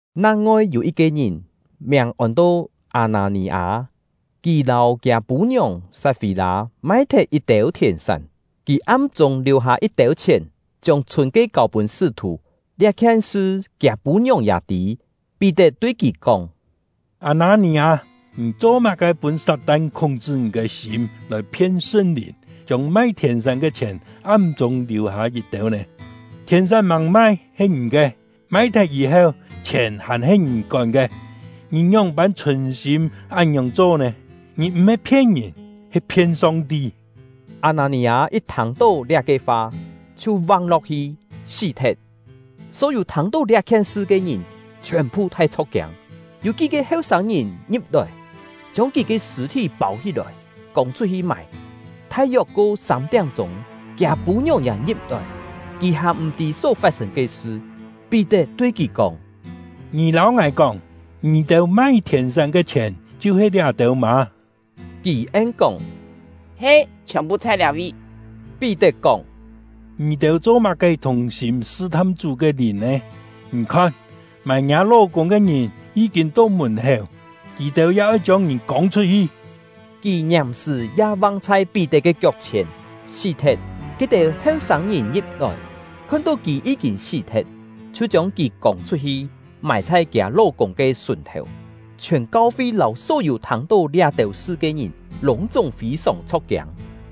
Nang-ngoi yû yit-ke ngìn, miàng ôn-to Â-nâ-nì-â; kì lâu kiâ pû-ngiòng Sat-fî-lâ mai-thet yit-têu thièn-sán. Kì am-chûng liù-hâ yit-têu chhièn, chiông chhûn ke kâu-pûn sṳ́-thù; liá-khien sṳ kiâ pû-ngiòng ya tî. Pí-tet tui kì kóng: “Â-nâ-nì-â, ngì cho-má-ke pûn Sat-tan khúng-chṳ ngì ke sîm, lòi phien Sṳn-Lìn, chiông mai thièn-sán ke chhièn am-chûng liù-hâ yit-têu nè? Thièn-sán màng mai, he ngì ke; mai-thet yî-heu, chhièn hàn-he ngì kón ke. Ngì ngióng-pân chhùn-sîm án-ngiòng cho nè? Ngì m̀-he phien ngìn, he phien Song-ti!” Â-nâ-nì-â yit thâng-tó liá-ke fa, chhiu vang-lo̍k-hi, sí-thet. Só-yû thâng-tó liá-khien sṳ ke ngìn chhiòn-phu thai chho̍k-kiâng. Yû kí-ke heu-sâng-ngìn ngi̍p-lòi, chiông kì ke sṳ̂-thí pâu-hí-lòi, kông-chhut-hi mài. Thai-yok ko sâm-tiám-chûng, kiâ pû-ngiòng ya ngi̍p-lòi; kì hàn m̀-tî só fat-sên ke sṳ. Pí-tet tui kì kóng: “Ngì lâu ngài kóng, ngì-têu mai thièn-sán ke chhièn chhiu-he liá-têu mâ?” Kì en-kóng: “He, chhiòn-phu chhai liá-vi.” Pí-tet kóng: “Ngì-têu cho-má-ke thùng-sîm sṳ-tham Chú ke Lìn nè? Ngì khon, mài ngiâ ló-kûng ke ngìn yí-kîn to mùn-héu, kì-têu ya oi chiông ngì kông-chhut-hi!” Kì ngiàm-sṳ̀ ya vang chhai Pí-tet ke kiok-chhièn, sí-thet. Ke-têu heu-sâng-ngìn ngi̍p-lòi, khon-tó kì yí-kîn sí-thet, chhiu chiông kì kông-chhut-hi, mài chhai kiâ ló-kûng ke sùn-thèu. Chhiòn kau-fi lâu só-yû thâng-tó liá-têu sṳ ke ngìn lûng-chúng fî-sòng chho̍k-kiâng.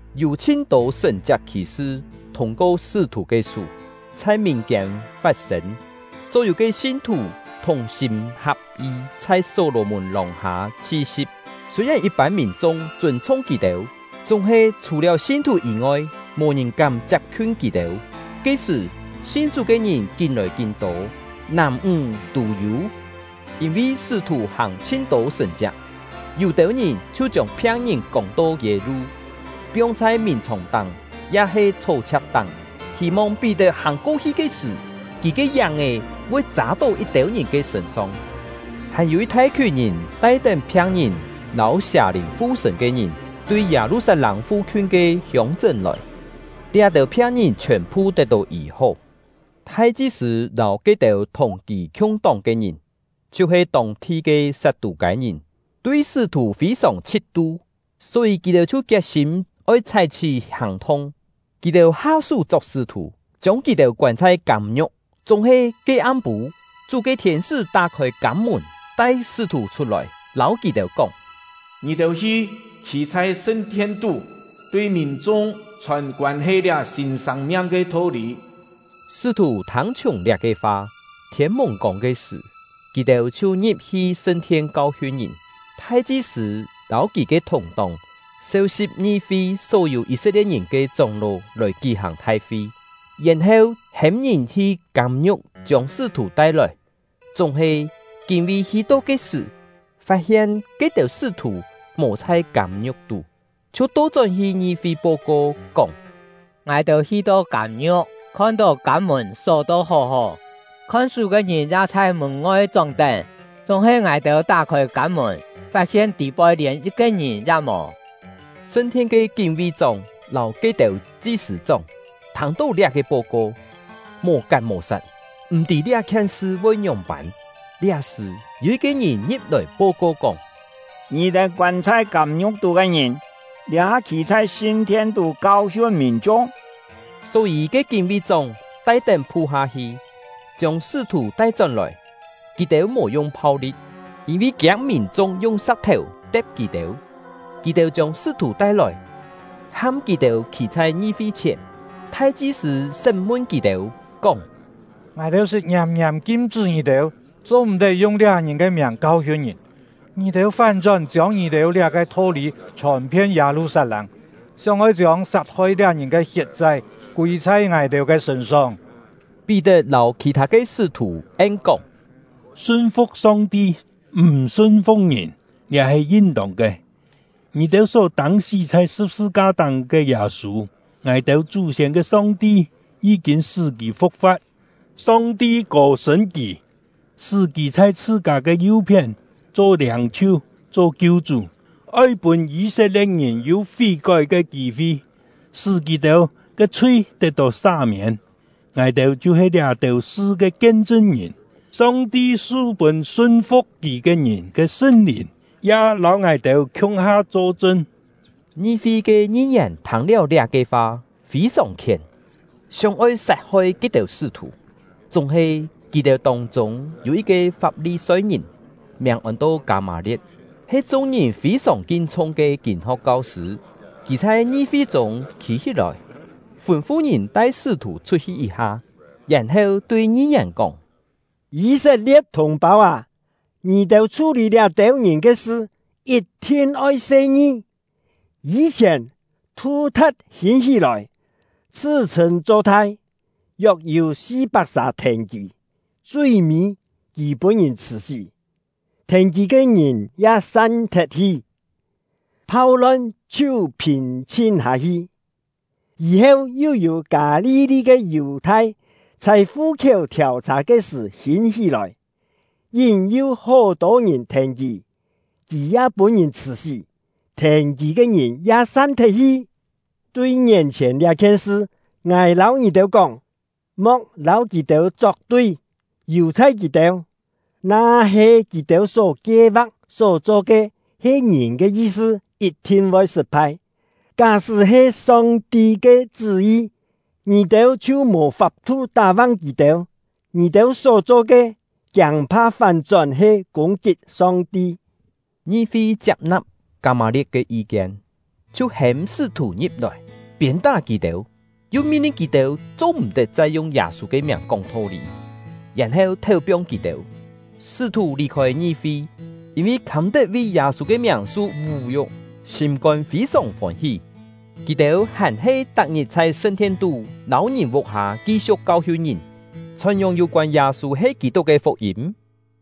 Yû chhin-tô sṳ̀n-chiak khì-sṳ thûng-ko sṳ́-thù ke sú, chhai mìn-kiên fat-sên; só-yû ke sin-thù thùng-sîm ha̍p-yi chhai Só-lò-mùn lòng-hâ chhi-si̍p. Sûi-yèn yit-pân mìn-chung chûn-chhung kì-têu, chúng-he chhù-liáu sin-thù yî-ngoi, mò ngìn kám chiap-khiun kì-têu. Ke-sṳ̀, sin Chú ke ngìn kín-lòi kín-tô, nàm-ńg tû yû. Yîn-vi sṳ́-thù hàng chhin-tô sṳ̀n-chiak, yû-têu ngìn chhiu chiông phiang-ngìn kông-to kiê-lu, piong chhai mìn-chhòng-táng ya-he chhó-chhia̍k-táng, hî-mong Pí-tet hàng-ko-hi ke sṳ̀, kì ke yáng-è voi châ-tó yit-têu ngìn ke sṳ̂n-song. Hàn-yû yit thai-khiùn ngìn tai-tén phiang-ngìn lâu sià-lìn fu-sṳ̂n ke ngìn, tui Yâ-lu-sat-lâng fu-khiun ke hiông-chṳ́n lòi; liá-têu phiang-ngìn chhiòn-phu tet-tó yî-hó. Thai-chi-sṳ̂ lâu ke-têu thùng kì khiung-tóng ke ngìn, chhiu-he tông-thi ke Sat-tû-kâi-ngìn, tui sṳ́-thù fî-sòng chhit-tu; só-yî kì-têu chhiu kiet-sîm oi chhái-chhí hàng-thung. Kì-têu ha-sú chok sṳ́-thù, chiông kì-têu koân chhai kâm-ngiu̍k. Chúng-he ke am-pû, Chú ke thiên-sṳ́ tá-khôi kâm-mùn, tai sṳ́-thù chhut-lòi, lâu kì-têu kóng: “Ngì-têu hi, khî chhai sṳn-thien-tú, tui mìn-chung chhòn koân-he liá sîn sâng-miang ke tho-lî.” Sṳ́-thù thâng-chhiùng liá-ke fa, thiên mùng-kông ke sṳ̀, kì-têu chhiu ngi̍p-hi sṳn-thien kau-hiun ngìn. Thai-chi-sṳ̂ lâu kì ke thùng-tóng seu-si̍p ngi-fi só-yû Yî-set-lie̍t-ngìn ke chóng-ló lòi kí-hàng thai-fi, yèn-heu hêm ngìn hi kâm-ngiu̍k chiông sṳ́-thù tai-lòi. Chúng-he, kín-ví hi-to ke sṳ̀, fat-hien ke-têu sṳ́-thù mò chhôi kâm-ngiu̍k tú, chhiu to-chón-hi ngi-fi po-ko, kóng: “Ngài-têu hi-to kâm-ngiu̍k, khon-tó kâm-mùn só-to hó-hó, khon-sú ke ngìn ya chhai mùn-ngoi chóng-tén; chúng-he ngài-têu tá-khôi kâm-mùn, fat-hien tî-poi lièn yit-ke ngìn ya mò!” Sṳn-thien ke kín-ví-chóng lâu ke-têu chi-sṳ̂-chóng thâng-tó liá-ke po-ko, mò-kat mò-sat, m̀ tî liá-khien sṳ voi ngióng-pân. Liá-sṳ̀, yû yit-ke ngìn ngi̍p-lòi po-ko kóng: “Ngì-têu koân chhai kâm-ngiu̍k tú ke ngìn, liá-ha khî chhai sṳn-thien-tú kau-hiun mìn-chung!” Só-yî ke kín-ví-chóng tai-tén phu-ha hi, chiông sṳ́-thù tai-chón-lòi. Kì-têu mò yung phau-li̍t, yîn-vi kiâng mìn-chung yung sa̍k-thèu te̍p kì-têu. Kì-têu chiông sṳ́-thù tai-lòi, ham kì-têu khî chhai ngi-fi-chhièn. Thai-chi-sṳ̂ sṳ́m-mun kì-têu, kóng: “Ngài-têu sṳt ngiàm-ngiàm kim-chṳ́ ngì-têu, cho-m̀-tet yung liá ngìn ke miàng kau-hiun ngìn, ngì-têu fán-chón chiông ngì-têu liá-ke tho-lî chhòn-phien Yâ-lu-sat-lâng, sióng-oi chiông sat-hoi liá ngìn ke hiet-chai kûi chhai ngài-têu ke sṳ̂n-song!” Pí-tet lâu khì-thâ ke sṳ́-thù en-kóng: “Sun-fu̍k Song-ti, m̀ sun-fu̍k ngìn, liá he yin-tông ke! Ngì-têu só tâng-sí chhai sṳ̍p-sṳ-ka-táng ke Yâ-sû, ngài-têu chú-siên ke Song-ti yí-kîn sṳ́ kì fu̍k-fa̍t. Song-ti kô-sṳ̂n kì, sṳ́ kì chhai chhṳ-kâ ke yu-phién cho Liâng-chhiu, cho Kiu-chú, oi pûn Yî-set-lie̍t-ngìn yû fí-kói ke kî-fi, sṳ́ kì-têu ke chhui tet-tó sa-miên. Ngài-têu chhiu-he liá-têu sṳ ke kien-chṳn-ngìn; Song-ti su-pûn sun-fu̍k Kì ke ngìn ke Sṳn-Lìn ya lâu ngài-têu khiung-ha cho-chṳn.” Ngi-fi ke ngi-yèn thâng-liáu liá-ke fa, fî-sòng khién, sióng-oi sat-hoi ke-têu sṳ́-thù. Chúng-he, kì-têu tông-chûng yû yit-ke Fap-li-soi-ngìn, miàng ôn-to Kâ-mâ-lie̍t, he chung-ngìn fî-sòng kin-chhung ke kîn-ho̍k kau-sṳ̂; kì chhai ngi-fi chûng khî-hí-lòi, fûn-fu ngìn tai sṳ́-thù chhut-hi yit-ha, yèn-heu tui ngi-yèn kóng: “Yî-set-lie̍t thùng-pâu â, ngì-têu chhú-lî liá-têu ngìn ke sṳ, yit-thin oi se-ngi! Yî-chhièn, Thu-tha̍t hîn-hí-lòi, chhṳ-chhṳ̂n cho thai, yok-yû si-pak-sà thèn kì. Chui-mî, kì pûn-ngìn chhṳ̀-sí, thèn kì ke ngìn ya san-thet-hi, phau-lon chhiu phìn-chhin hâ-hi. Yî-heu yu yû Kâ-li-li ke Yù-thai chhai fu-khiéu thiàu-chhà ke sṳ̀ hîn-hí-lòi, yín-yu hó-tô ngìn thèn kì; kì ya pûn-ngìn chhṳ̀-sí, thèn kì ke ngìn ya san-thet-hi. Tui ngién-chhièn liá-khien sṳ, ngài lâu ngì-têu kóng, mo̍k lâu kì-têu chok-tui, yù-chhai kì-têu! Na-he kì-têu só kie-va̍k, só cho ke, he ngìn ke yi-sṳ, yit-thin voi sṳt-phai; ká-sṳ́ he Song-ti ke chṳ́-yi, ngì-têu chhiu mò fap-thu tá-vang kì-têu. Ngì-têu só cho ke, kiâng-pha fán-chón he kûng-kit Song-ti!” Ngi-fi chiap-na̍p Kâ-mâ-lie̍t ke yi-kien, chhiu hêm sṳ́-thù ngi̍p-lòi, piên-tá kì-têu, yu min-lin kì-têu cho-m̀-tet chai yung Yâ-sû ke miàng kóng tho-lî, yèn-heu théu-piong kì-têu. Sṳ́-thù lì-khôi ngi-fi, yîn-vi khâm-tet vi Yâ-sû ke miàng su vú-yu̍k, sîm-kôn fî-sòng fôn-hí. Kì-têu hàn-he tak-ngit chhai sṳn-thien-tú lâu ngìn vuk-hâ ki-siu̍k kau-hiun ngìn, chhòn-yòng yû-koân Yâ-sû he Kî-tuk ke fuk-yîm.